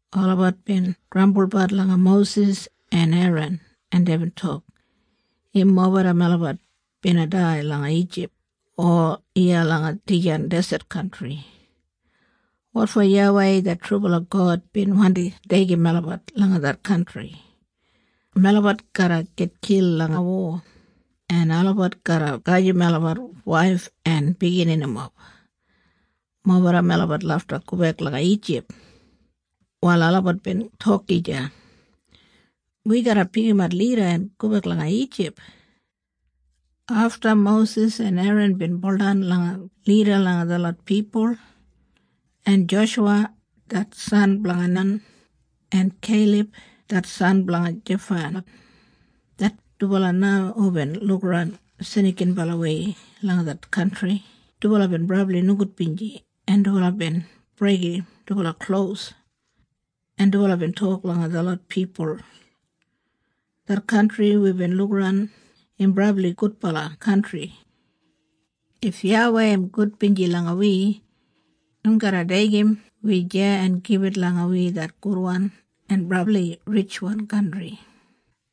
Olabat bin grambulbat langa Mosis en Eran, en deibin tok, “Im mobeda melabat bina dai langa Ijip, o iya langa dijan deset kantri. Wotfo YAWEI det trubala God bin wandi deigim melabat langa det kantri? Melabat garra gitkil langa wo, en olabat garra gajim melabat waif en bigininimob. Mobeda melabat lafta gobek langa Ijip.” Wal olabat bin tok gija, “Wi garra pikimat lida en gobek langa Ijip.” Afta Mosis en Eran bin baudan langa graun lida langa detlot pipul. En Joshuwa, det san blanga Nan, en Keilab det san blanga Jefana, det dubala na hubin lukaran snikinbalawei langa det kantri, dubala bin brabli nogudbinji en dubala bin breigim dubala klos. En dubala bin tok langa detlot pipul, “Det kantri wibin lukaran im brabli gudbala kantri. If YAWEI im gudbinji langa wi, im garra deigim wi deya en gibit langa wi det gudwan en brabli ritjwan kantri.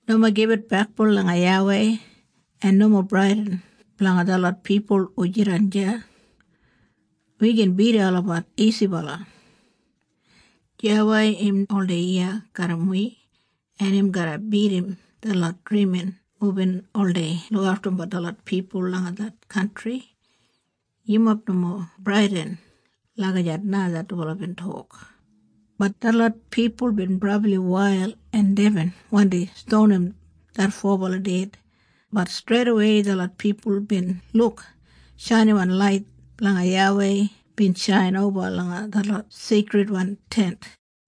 Nomo gibit bekboun langa YAWEI, en nomo bradin blanga detlot pipul hu jidan deya. Wi gin bidim olabat isibala. YAWEI im oldei iya garram wi en im garra bidim detlot drimin hubin oldei lukaftumbat detlot pipul langa det kantri. Yumob nomo bradin.” Lagijat na det dubala bin tok. Bat detlot pipul bin brabli wail en deibin wandi stonim det fobala ded, bat streidawei detlot pipul bin luk shainiwan lait blanga YAWEI bin shain oba langa det Seikridwan Tent.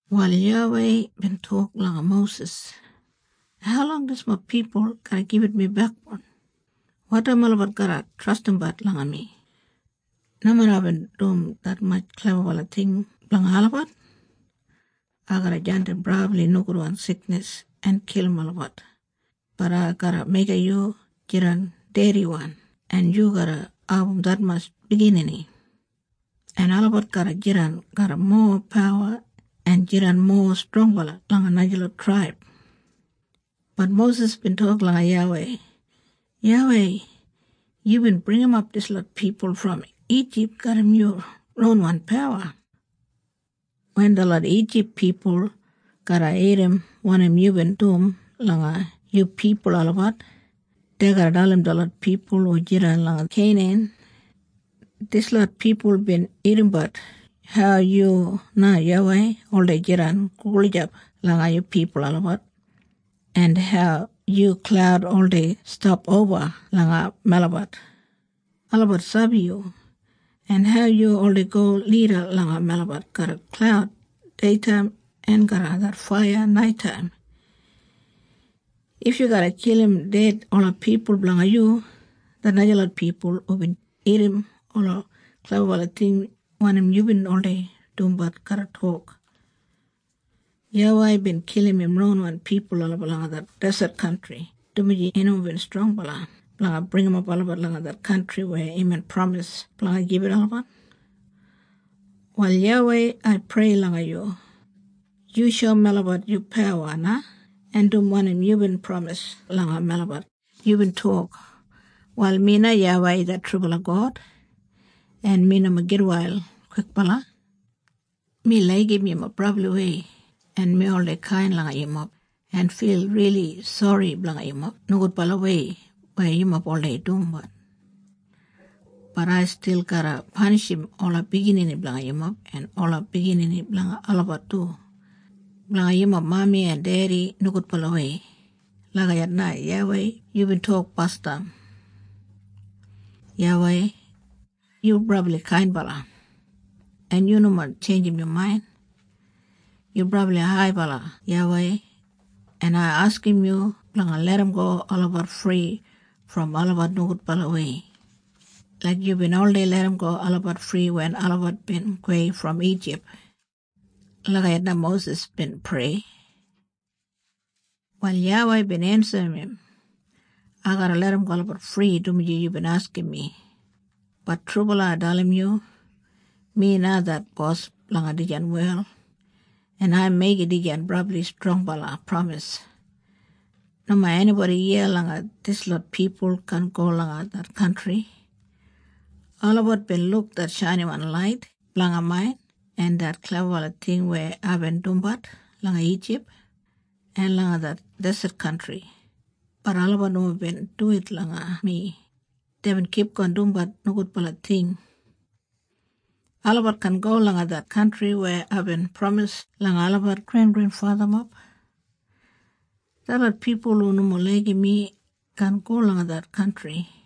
Wal YAWEI bin tok langa Mosis, “Haulong dislot pipul garra gibit mi bekboun? Wotaim olabat garra trastimbat langa mi, nomeda aibin dum detmatj klebabala ting blanga olabat? Ai garra jandim brabli nogudwan siknis en kilim olabat, bat ai garra meigim yu jidan dediwan en yu garra abum detmatj biginini, en olabat garra jidan garram mowa pawa en jidan mowa strongbala langa najalot traib.” Bat Mosis bin tok langa YAWEI, “YAWEI, yubin bringimap dislot pipul brom Ijip garram yu ronwan pawa. Wen detlot Ijip pipul garra irrim wanim yubin dum langa yu pipul olabat, dei garra dalim detlot pipul hu jidan langa Keinan. Dislot pipul bin irrimbat hau yu na YAWEI oldei jidan gulijap langa yu pipul olabat, en hau yu klaud oldei stap oba langa melabat. Olabat sabi yu, en hau yu oldei go lida langa melabat garram klaud deitaim, en garram det faiya naitaim. If yu garra kilim ded ola pipul blanga yu, det najalot pipul hubin irrim ola klebabala ting wanim yubin oldei dumbat garra tok, ‘YAWEI bin kilim im ronwan pipul olabat langa det deset kantri dumaji im nomo strongbala blanga bringimap olabat langa det kantri weya imbin pramis blanga gibit olabat.’ Wal YAWEI ai prei langa yu. Yu shoum melabat yu pawa na en dum wanim yubin pramis langa melabat. Yubin tok, ‘Wal mi na YAWEI det trubala God, en mi nomo gitwail kwikbala. Mi laigim yumob brabliwei en mi oldei kain langa yumob en fil rili sori blanga yumob nogudbalawei weya yumob oldei dumbat. Bat ai stil garra panishim ola biginini blanga yumob en ola biginini blanga olabat du, blanga yumob mami en dedi nogudbalawei.’ Lagijat na YAWEI yubin tok basdam. YAWEI, yu brabli kainbala, en yu nomo tjeinjim yu main. Yu brabli haibala YAWEI, en ai askim yu blanga larramgo olabat fri brom olabat nogudbalawei, laik yubin oldei larramgo olabat fri wen olabat bin gowei brom Ijip.” Lagijat na Mosis bin prei. Wal YAWEI bin ensim im, “Ai garra larramgo olabat fri dumaji yubin askim mi. Bat trubala ai dalim yu. Mi na det bos blanga dijan wel, en ai meigim dijan brabli strongbala pramis. Nomo enibodi iya langa dislot pipul kaan go langa det kantri. Olabat bin luk det shainiwan lait blanga main en det klebabala ting weya aibin dumbat langa Ijip, en langa det deset kantri, bat olabat nomo bin duwit langa mi, deibin kipgon dumbat nogudbala ting. Olabat kaan go langa det kantri weya aibin pramis langa olabat grengrenfathamob. Detlot pipul hu nomo laigim mi kaan go langa det kantri.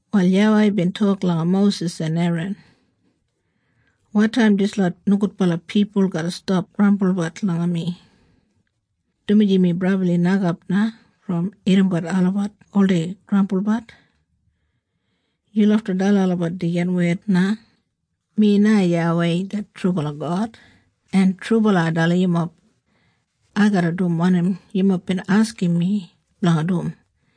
Wal YAWEI bin tok langa Mosis en Eran, “Wotaim dislot nogudbala pipul garra stap grambulbat langa mi? Dumaji mi brabli nokap na brom irrimbat olabat oldei grambulbat. Yu lafta dalim olabat dijan wed na, ‘Mi na YAWEI det trubala God, en trubala ai dalim yumob. Ai garra dum wanim yumob bin askim mi blanga dum.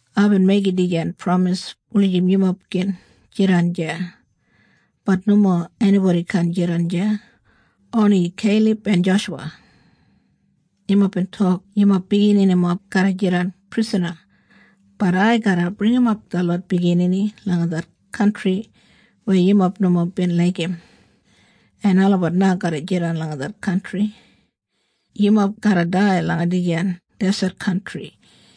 Aibin meigim dijan pramis wulijim yumob gin jidan deya, bat nomo enibodi kaan jidan deya, oni Keilab en Joshuwa. Yumob bin tok yumob bigininimob garra jidan prisana, bat ai garra bringimap detlot biginini langa det kantri weya yumob nomo bin laigim, en olabat na garra jidan langa det kantri. Yumob garra dai langa dijan deset kantri.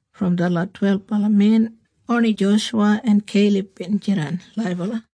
Brom detlot twelbala men oni Joshuwa en Keilab bin jidan laibala.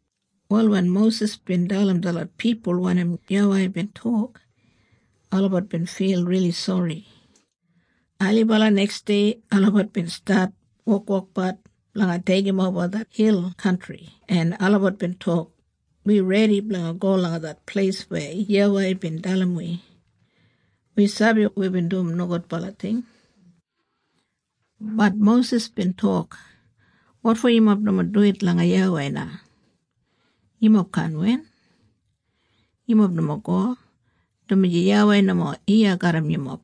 Wal wen Mosis bin dalim detlot pipul wanim YAWEI bin tok, olabat bin fil rili sori. Ailibala neksdei, olabat bin stat wokwokbat blanga deigimoba det hil kantri en olabat bin tok, “Wi redi blanga go langa det pleis weya YAWEI bin dalim wi. Wi sabi wibin dum nogudbala ting.” Bat Mosis bin tok, “Wotfo yumob nomo duwit langa YAWEI na? Yumob kaan win. Yumob nomo go, dumaji YAWEI nomo iya garram yumob,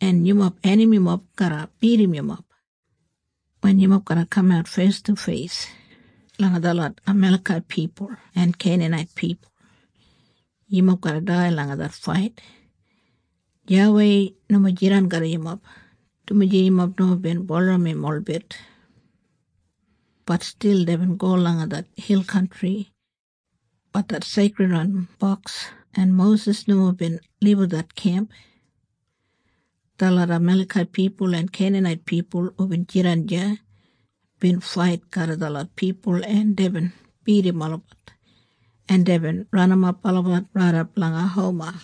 en yumob enamimob garra bidim yumob. Wen yumob garra kamat feis du feis langa detlot Amalekait pipul en Keinanait pipul, yumob garra dai langa det fait. YAWEI nomo jidan garram yumob, dumaji yumob nomo bin bulurrum im holbit.” Bat stil deibin go langa det hil kantri, bat det Seikridwan Boks en Mosis nomo bin libum det kemp. Detlot Amalekait pipul en Keinanait pipul hubin jidan deya, bin fait garram detlot pipul en deibin bidim olabat, en deibin ranimap olabat raidap langa Homa.